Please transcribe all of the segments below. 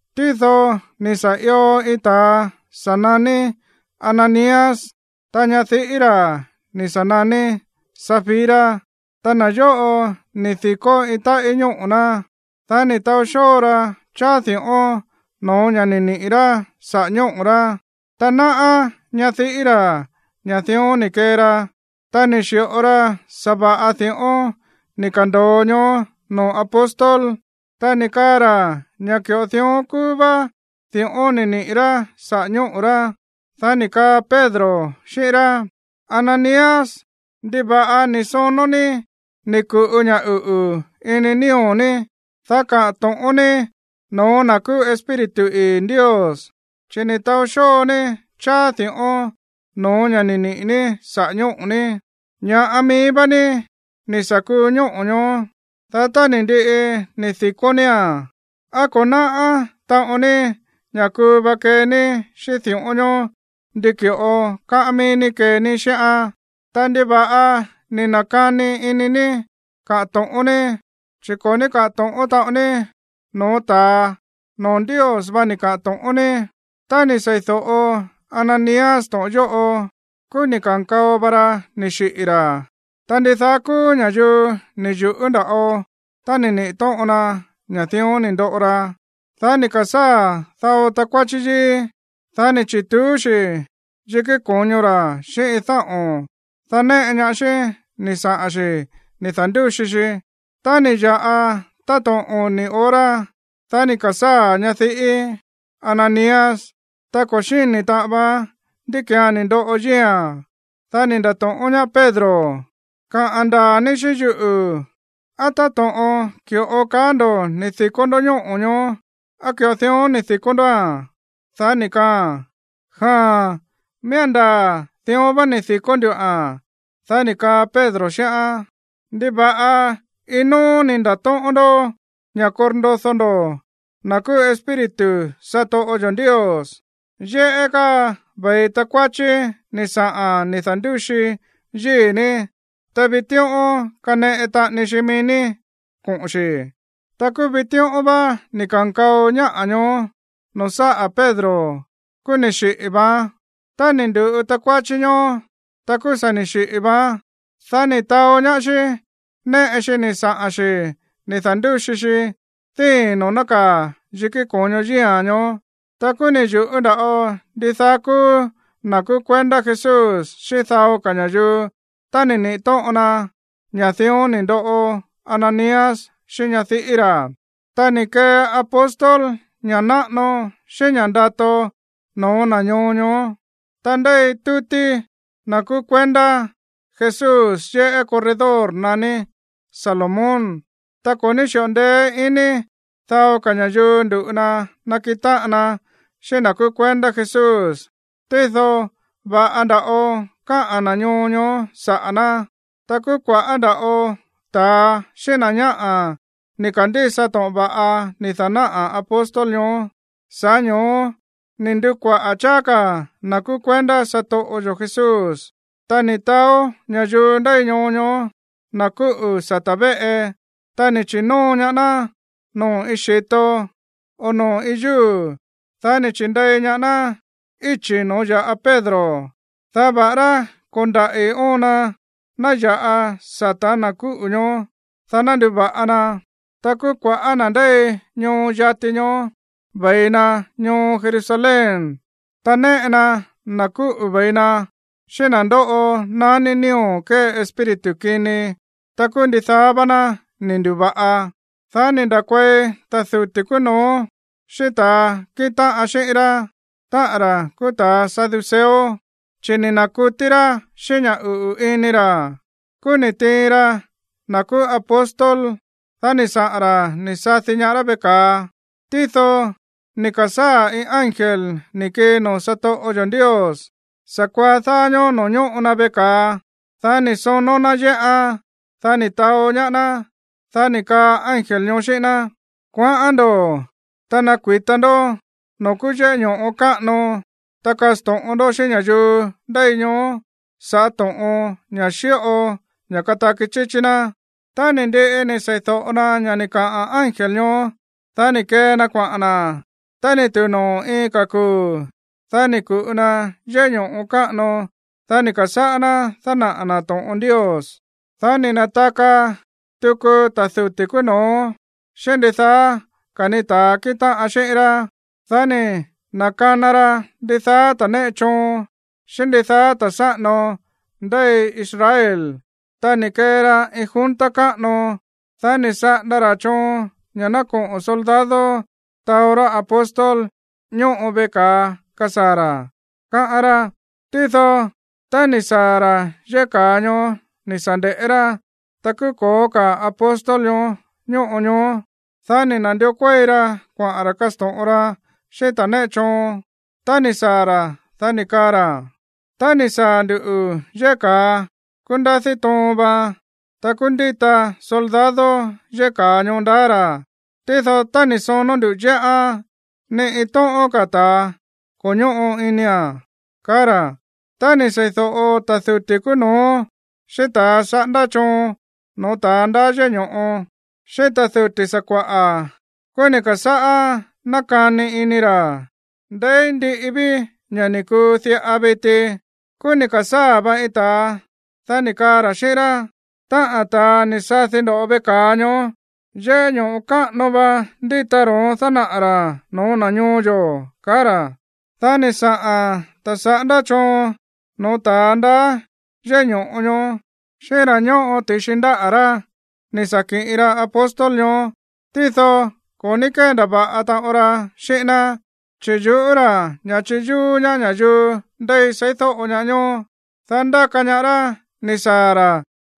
Tído ni̱ sa̱ ió iin ta̱a sa̱ naní Ananías, ta ñadiꞌí ra̱ ni̱ sa̱ naní Safira. Ta na̱ yóꞌo ni̱ di̱kó iin táꞌí ñóꞌo̱ ná. Dá ni̱ taó xóo ra cháá di̱ꞌón no̱ó ña̱ ni̱ niꞌi̱ rá saꞌa̱ ñóꞌo̱ rá. Ta náꞌá ñadiꞌí ra̱ ña̱ dión ni̱ kee ra. Ta ni̱ xi̱ꞌo ra sa̱va̱ꞌa di̱ꞌón ni̱ ka̱ndo̱o ñoó noo̱ apóstol. Ta ni̱ kaa ra̱ ña̱ ki̱ꞌo dión kúú vá di̱ꞌón ni̱ niꞌi̱ rá saꞌa̱ ñóꞌo̱ rá. Dá ni̱ kaa Pedro xíꞌín rá: ―Ananías, ¿ndiva̱ꞌa ni̱ sonó ní ni̱ ku̱ꞌu ña̱ uꞌu̱ ini nío̱ ní, dá kaꞌa̱n to̱ꞌón ní no̱ó na̱ kúú Espíritu ii̱ Ndios? Chi̱ ni̱ taó xóo ní cháá di̱ꞌón no̱ó ña̱ ni̱ niꞌi̱ ní saꞌa̱ ñóꞌo̱ ní. Ña̱ꞌa mií vá ní ni̱ sa̱ kuu ñóꞌo̱ ñoó. Dá tá ni̱ ndiꞌi ni̱ di̱kó nía̱n, ¿á ko̱ náꞌá taꞌon ní ña̱ kuu va kee ní xíꞌín di̱ꞌón ñoó ndi ki̱ꞌo káꞌán mií ní kee ní xíꞌán? Ta, ¿ndiva̱ꞌa ni̱ na̱kani ini ní kaꞌa̱n to̱ꞌón ní? Chi̱ ko̱ ní káꞌa̱n to̱ꞌón taꞌon ní no̱ó ta̱a, noo̱ Ndios vá ni̱ kaꞌa̱n to̱ꞌón ní. Tá ni̱ sei̱do̱ꞌo Ananías to̱ꞌon yóꞌo, kúú ni̱ ka̱nkao va ra ni̱ xiꞌi̱ ra̱. Ta ndidaá kúú ña̱yuu ni̱ yu̱ꞌú nda̱ꞌo tá ni̱ niꞌi̱ tóꞌon na ña̱ dión ni̱ ndoꞌo ra. Dá ni̱ ka̱sáa̱ dao takuáchí yíí. Dá ni̱ chi̱tuú xi̱ yikí ko̱ño ra̱ xíꞌín iin dáꞌo̱n. Dá néꞌe ñaá xí ni̱ saꞌa̱n xi̱ ni̱ da̱ndúxi xi. Tá ni̱ ya̱ꞌa táto̱ꞌon oni̱ hora, dá ni̱ ka̱sáa̱ ñadiꞌí Ananías. Ta ko̱ xíni̱ taꞌan vaán ndí ki̱án ni̱ ndoꞌo yíi̱a̱n. Dá ni̱ nda̱to̱ꞌón ñaá Pedro: ―Kaꞌa̱n ndaa̱ ní xíꞌín yuꞌu̱. ¿Á táto̱ꞌon ki̱ꞌo kaá ndo̱ ni̱ di̱kó ndó ñóꞌo̱ ñoó, á ki̱ꞌo dión ni̱ di̱kó ndóa̱n? Dá ni̱ kaaa̱n: ―Jaa̱n. Miía̱n ndaa̱ dión vá ni̱ di̱kó ndúa̱n. Dá ni̱ kaa Pedro xíꞌán: ―¿Ndiva̱ꞌa iin nóó ni̱ nda̱tóꞌón ndó ña̱ korndodó ndó na̱ kúú Espíritu satoꞌo yo̱ Ndios? Yéꞌé káa ve̱i takuáchí ni̱ saꞌa̱n ni̱ da̱ndúxi yíi̱ ní. Ta vitíꞌón kaneꞌe taꞌani xi mií ní koꞌo̱n xi̱. Ta kúú vitíꞌón vá ni̱ ka̱nkao ñáꞌa̱ ñoó noo̱ sáꞌa̱ Pedro, kúú ni̱ xiꞌi̱ vaán. Tá ni̱ ndu̱ꞌu takuáchí ñoó, ta kúú sa̱ ni̱ xiꞌi̱ vaán. Dá ni̱ taó ñaá xí néꞌe xi ni̱ saꞌa̱n xi̱ ni̱ da̱ndúxi xi díi̱n noo̱ nákaa̱ yikí ko̱ño yíi̱a̱n ñoó. Ta kúú ni̱ yu̱ꞌú nda̱ꞌo ndidaá kúú na̱ kúú kuendá Jesús xíꞌín dao ka̱ ña̱yuu tá ni̱ niꞌi̱ tóꞌon na ña̱ dión ni̱ ndoꞌo Ananías xíꞌín ñadiꞌí ra̱. Ta ni̱ kee apóstol ña̱ꞌa náꞌano xíꞌín ña̱ꞌa ndato no̱ó na̱ ñoo ñoó. Ta ndéi tútí na̱ kúú kuendá Jesús yéꞌé corredor naní Salomón. Ta ko̱ ní xíꞌo ndeé iní dao ka̱ ña̱yuu ndu̱ꞌu na nakiꞌin táꞌan na xíꞌín na̱ kúú kuendá Jesús, tído va̱ꞌa nda̱ꞌo káꞌa̱n na̱ ñoo ñoó saꞌa̱ ná. Ta kúú kua̱ꞌá nda̱ꞌo ta̱a xíꞌín na̱ ñáꞌa̱ ni̱ ka̱ndísa to̱ꞌon va̱ꞌa ni̱ da̱náꞌa̱ apóstol ñoó, sa̱ꞌá ño̱ó ni̱ ndu̱kuaꞌa̱ cháá ka̱ na̱ kúú kuendá satoꞌo yo̱ Jesús. Ta ni̱ taó ña̱yuu ndéi ñoo ñoó na̱ kúꞌu̱ sata̱ véꞌe, ta ni̱ chi̱nóo ñaá ná noo̱ iin xi̱to, o noo̱ iin yúu̱. Dá ni̱ chi̱ndei ñaá ná íchi̱ noo̱ ya̱ꞌa Pedro, dá va̱ꞌará ko̱ndaꞌi̱ óon na ná ya̱ꞌa sata̱ na̱ kúꞌu̱ ñoó, dá ná nduva̱ꞌa na. Ta kúú kua̱ꞌá na̱ ndéi ñoo yati ñoó ve̱i na ñoo Jerusalén, ta néꞌe na na̱ kúꞌu̱ ve̱i na xíꞌín na̱ ndóꞌo naní nío̱ kée espíritu kini. Ta kúú ndidaá vá ná ni̱ ndu̱va̱ꞌa. Dá ni̱ nda̱kuei ta̱ duti̱ kúú no̱ó xíꞌín ta̱a kíꞌin táꞌan xíꞌín rá, táꞌa̱n ra̱ kúú ta̱ saduceo, chi̱ ni̱ na̱kutí rá xíꞌín ña̱ uꞌu̱ ini ra̱. Kúú ni̱ tiin ra na̱ kúú apóstol, dá ni̱ saꞌa̱n ra̱ ni̱ sadi ñaá rá veꞌe ka̱a. Tído ni̱ ka̱sáa̱ iin ángel ni̱ kii noo̱ satoꞌo yo̱ Ndios sa̱kuaá dáá ñóó noo̱ ñóꞌo na veꞌe ka̱a. Dá ni̱ sonó ná yéꞌán. Dá ni̱ taó ñaá ná. Dá ni̱ kaa ángel ñoó xíꞌín ná: ―Kuaꞌán ndo̱, ta nakui̱ta ndó noo̱ kúú yéꞌé ño̱ꞌo káꞌano. Ta kasto̱ꞌon ndó xíꞌín ña̱yuu ndéi ñoó sa̱ꞌá to̱ꞌon, ña̱ xíꞌo ña̱ kataki chíchí ná. Tá ni̱ ndiꞌi ni̱ sei̱do̱ꞌo na ña̱ ni̱ kaꞌa̱n ángel ñoó, dá ni̱ kee na kuaꞌa̱n na̱. Tá ni̱ tu̱u noo̱ iin ka̱ kuu̱, dá ni̱ ku̱ꞌu na yéꞌé ño̱ꞌo káꞌano. Dá ni̱ ka̱sáꞌá ná dánaꞌa̱ na̱ to̱ꞌon Ndios. Dá ni̱ na̱taka tuku ta̱ duti̱ kúú no̱ó xíꞌín ndidaá ka̱ ni ta̱a kíꞌin táꞌan xíꞌín rá. Dá ni̱ na̱kana ra ndidaá ta̱a néꞌe choon xíꞌín ndidaá ta̱ sáꞌano ndéi Israel, ta ni̱ kee ra iin junta káꞌano. Dá ni̱ saꞌanda ra̱ choon ña̱ ná koꞌo̱n soldado taó rá apóstol ñóꞌo veꞌe ka̱a kasaa̱ ra̱, káꞌán rá. Tído, tá ni̱ saa̱ ra̱ yéꞌé ka̱a ñoó ni̱ sa̱ nde̱ꞌé rá, ta kúú ko̱ó ka̱ apóstol ñoó ñóꞌo ñoó. Dá ni̱ na̱ndió kuéi ra kuaꞌa̱n ra̱ kasto̱ꞌon ra xíꞌín ta̱ néꞌe choon. Tá ni̱ saa̱ ra̱, dá ni̱ kaa ra̱: ―Tá ni̱ saa̱ ndu̱ yéꞌé ka̱a, kúú ndadí toon vaan. Ta kúú ndíta soldado yéꞌé ka̱a ñoó ndaá ra̱. Tído, tá ni̱ sonó ndú yéꞌán, ni iin tóꞌón ka̱ ta̱a ko̱ ñóꞌo inia̱n ―kaá ra̱. Tá ni̱ sei̱do̱ꞌo ta̱ duti̱ kúú no̱ó, xíꞌín ta̱a saꞌándá choon no̱ó ta̱a ndaá yéꞌé ño̱ꞌo, xíꞌín ta̱ duti̱ sakua̱ꞌa̱, kúú ni̱ ka̱sáꞌá nákani ini ra̱: “¿Ndeí ndiꞌi ví ña̱ ni̱ kuu diꞌa viti?” Kúú ni̱ ka̱sáa̱ va iin ta̱a. Dá ni̱ kaa ra̱ xíꞌín rá: ―Táꞌa̱n ta̱a ni̱ sadi ndo̱ veꞌe ka̱a ñoó, yéꞌé ño̱ꞌo káꞌano va ndíta ro̱ón dánaꞌa̱ ra̱ no̱ó na̱ ñoo yo̱ ―kaá ra̱. Dá ni̱ saꞌa̱n ta̱ saꞌándá choon no̱ó ta̱a ndaá yéꞌé ño̱ꞌo ñoó xíꞌín ra̱ ñóꞌo ti̱xi ndáꞌa̱ rá ni̱ sa̱ kiꞌin ra apóstol ñoó. Tído ko̱ ní kéndava̱ꞌa taꞌon ra xíꞌín ná, chi̱ yu̱ꞌú ra̱ ña̱ chiyúú ñaá ña̱yuu ndéi seídóꞌo ñaá ñoó. Dá ndáka ñaá rá ni̱ saa̱ ra̱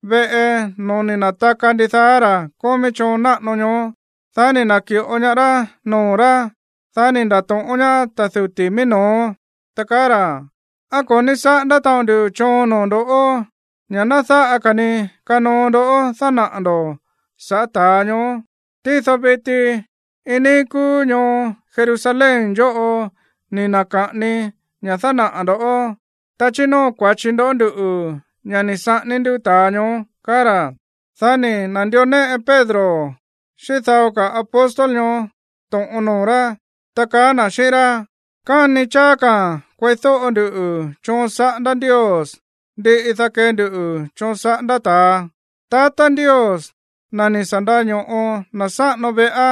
veꞌe no̱ó ni̱ na̱taka ndidaá ra̱ kómí choon náꞌano ñoó, dá ni̱ na̱ki̱ꞌo ñaá rá noo̱ rá. Dá ni̱ nda̱to̱ꞌón ñaá ta̱ duti̱ mií no̱ó, ta kaá ra̱: ―¿Á ko̱ ní saꞌándá taꞌon ndu choon noo̱ ndo̱ ña̱ ná dáꞌa ka̱ ni kanoo ndó dánaꞌa̱ ndo̱ sa̱ꞌá ta̱a ñoó? Tído viti iin níí kúú ñoo Jerusalén yóꞌo ni̱ na̱ka̱ꞌani ña̱ dánaꞌa̱ ndo̱. Ta chínóo kua̱chi ndo̱ nduꞌu̱ ña̱ ni̱ saꞌání ndú ta̱a ñoó ―kaá ra̱. Dá ni̱ na̱ndió néꞌe Pedro xíꞌín dao ka̱ apóstol ñoó to̱ꞌon noo̱ rá, ta kaá na̱ xíꞌín rá: ―Káni cháá ka̱a̱n kueídóꞌo ndu choon saꞌándá Ndios, ndiꞌi, dá kee ndu choon saꞌándá ta̱a. Tatá Ndios, na̱ ni̱ sa̱ ndaño̱ꞌo na̱ sáꞌano veꞌá,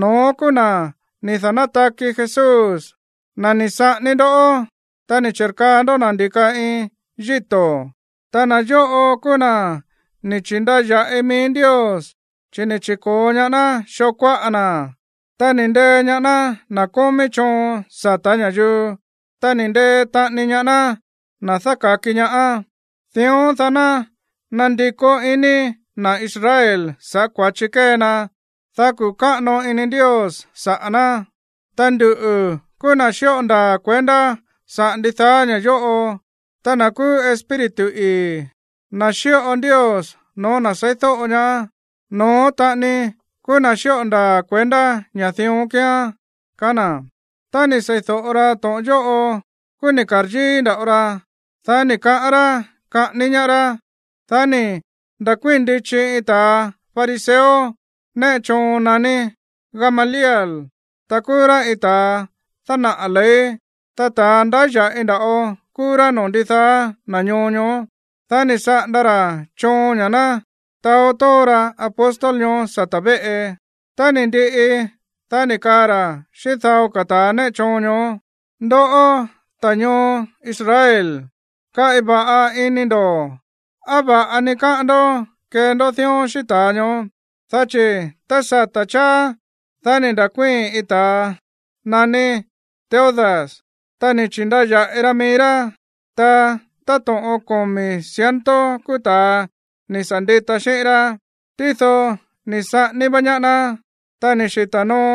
no̱ón kúú na̱ ni̱ da̱nátaki Jesús, na̱ ni̱ saꞌání ndoꞌó tá ni̱ chi̱rkaa ndó na̱ ndi̱ka iin yíto̱. Ta na̱ yóꞌo kúú na̱ ni̱ chi̱ndaya̱ꞌi mií Ndios, chi̱ ni̱ chi̱ko̱o ñaá ná xoo kuáꞌa na̱. Ta ni̱ ndee ñaá ná na̱ kómí choon sata̱ ña̱yuu, ta ni̱ ndee taꞌani ñaá ná na̱ dáka̱ki ñaá. Dión, dá ná nandikó iní na̱ Israel sa̱ꞌá kua̱chi kée na, dá kuꞌu̱ káꞌano ini Ndios saꞌa̱ ná. Ta nduꞌu̱ kúú na̱ xíꞌo ndaa̱ kuendá saꞌa̱ ndidaá ña̱ yóꞌo. Ta na̱ kúú Espíritu ii̱, na̱ xíꞌo Ndios no̱ó na̱ seídóꞌo ñaá, no̱ón taꞌani kúú na̱ xíꞌo ndaa̱ kuendá ña̱ dión kíán ―kaá na̱. Tá ni̱ sei̱do̱ꞌo ra to̱ꞌon yóꞌo, kúú ni̱ ka̱ryíí nda̱ꞌo ra. Dá ni̱ kaꞌán rá kaꞌání ñaá rá. Dá ni̱ nda̱kuíi̱n ndichi iin ta̱ fariseo néꞌe choon naní Gamaliel, ta kúú rá iin ta̱a dánaꞌa̱ ley. Ta ta̱ ndáya̱ꞌi nda̱ꞌo kúú rá noo̱ ndidaá na̱ ñoo ñoó. Dá ni̱ saꞌanda ra̱ choon ña̱ ná taó tóo ra apóstol ñoó sata̱ véꞌe. Tá ni̱ ndiꞌi, dá ni̱ kaa ra̱ xíꞌín dao ka̱ ta̱ néꞌe choon ñoó: ―Ndoꞌó, ta̱ ñoo Israel, kaꞌi va̱ꞌa ini ndo̱ á va̱ꞌa ni káꞌán ndó kee ndó dión xíꞌín ta̱a ñoó. Dá chi̱ tá sata̱ cháá, dá ni̱ nda̱kuíi̱n iin ta̱a naní Teudas. Ta ni̱ chi̱ndaya̱ꞌi ra mií rá, ta táto̱ꞌon komi̱ ciento kúú ta̱a ni̱ sa̱ ndita xíꞌín rá. Tído ni̱ saꞌání vá ñaá ná. Ta ni̱ xita̱ noo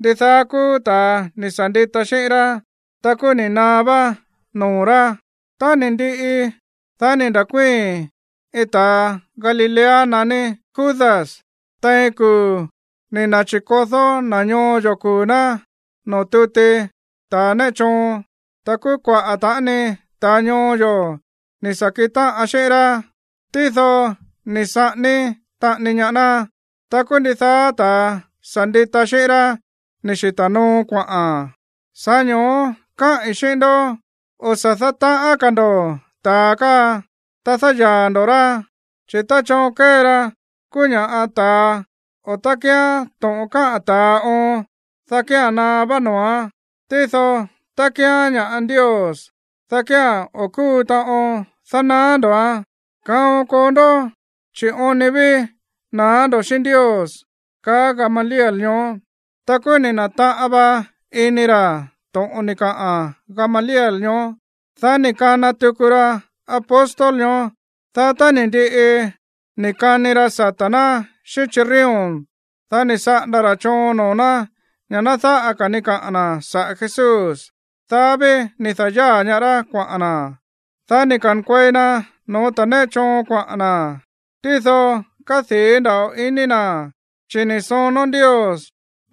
ndidaá kúú ta̱a ni̱ sa̱ ndita xíꞌín rá. Ta kúú ni̱ naá vá noo̱ rá. Tá ni̱ ndiꞌi, dá ni̱ nda̱kuíi̱n iin ta̱a Galilea naní Judas tein kuu̱ ni̱ na̱chi̱kodó na̱ ñoo yo̱ kuu̱ ná noo̱ tuti ta̱a néꞌe choon. Ta kúú kuaꞌa̱ taꞌani ta̱a ñoo yo̱ ni̱ sa̱ kiꞌin táꞌan xíꞌín rá. Tído ni̱ saꞌání taꞌani ñaá ná. Ta kúú ndidaá ta̱a sa̱ ndita xíꞌín rá ni̱ xita̱ noo kuaꞌa̱n. Sa̱ꞌá ño̱ó káꞌi̱n xíꞌín ndó, o̱ sa̱ dátaꞌán ka̱ ndo̱ ta̱a káa, ta dáyaa̱ ndo̱ rá. Chi̱ tá choon kée ra kúú ña̱ꞌa ta̱a o tá kíán to̱ꞌon káꞌa̱n ta̱a oon, dá kía̱n naá vá noo̱án. Tído tá kíán ña̱ꞌa Ndios, dá kía̱n o̱ kúu taꞌon dánaá ndo̱án. Kaon koo ndó, chi̱ oon ni ví na̱á ndo̱ xíꞌín Ndios ―kaá Gamaliel ñoó. Ta kúú ni̱ na̱taꞌan va ini ra̱ to̱ꞌon ni̱ kaꞌa̱n Gamaliel ñoó. Dá ni̱ kana tuku ra apóstol ñoó. Dá tá ni̱ ndiꞌi ni̱ kani ra sata̱ ná xíꞌín chirrión, dá ni̱ saꞌanda ra̱ choon noo̱ ná ña̱ ná dáꞌa ka̱ ni kaꞌa̱n na̱ saꞌa̱ Jesús. Dá ví ni̱ da̱yáa̱ ñaá rá kuaꞌa̱n na̱. Dá ni̱ ka̱nkuei na no̱ó ta̱ néꞌe choon kuaꞌa̱n na̱. Tído kádii̱ nda̱ꞌo ini na̱, chi̱ ni̱ sonó Ndios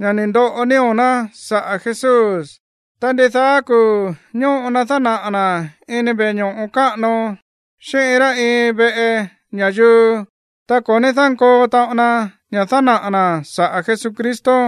ña̱ ni̱ ndoꞌo nío̱ ná saꞌa̱ Jesús. Ta ndidaá kuu̱ ñóꞌo na dánaꞌa̱ na̱ ini veꞌe ño̱ꞌo káꞌano, xíꞌín iin rá iin veꞌe ña̱yuu, ta ko̱ ní dánkoo taꞌon na ña̱ dánaꞌa̱ na̱ saꞌa̱ Jesucristo.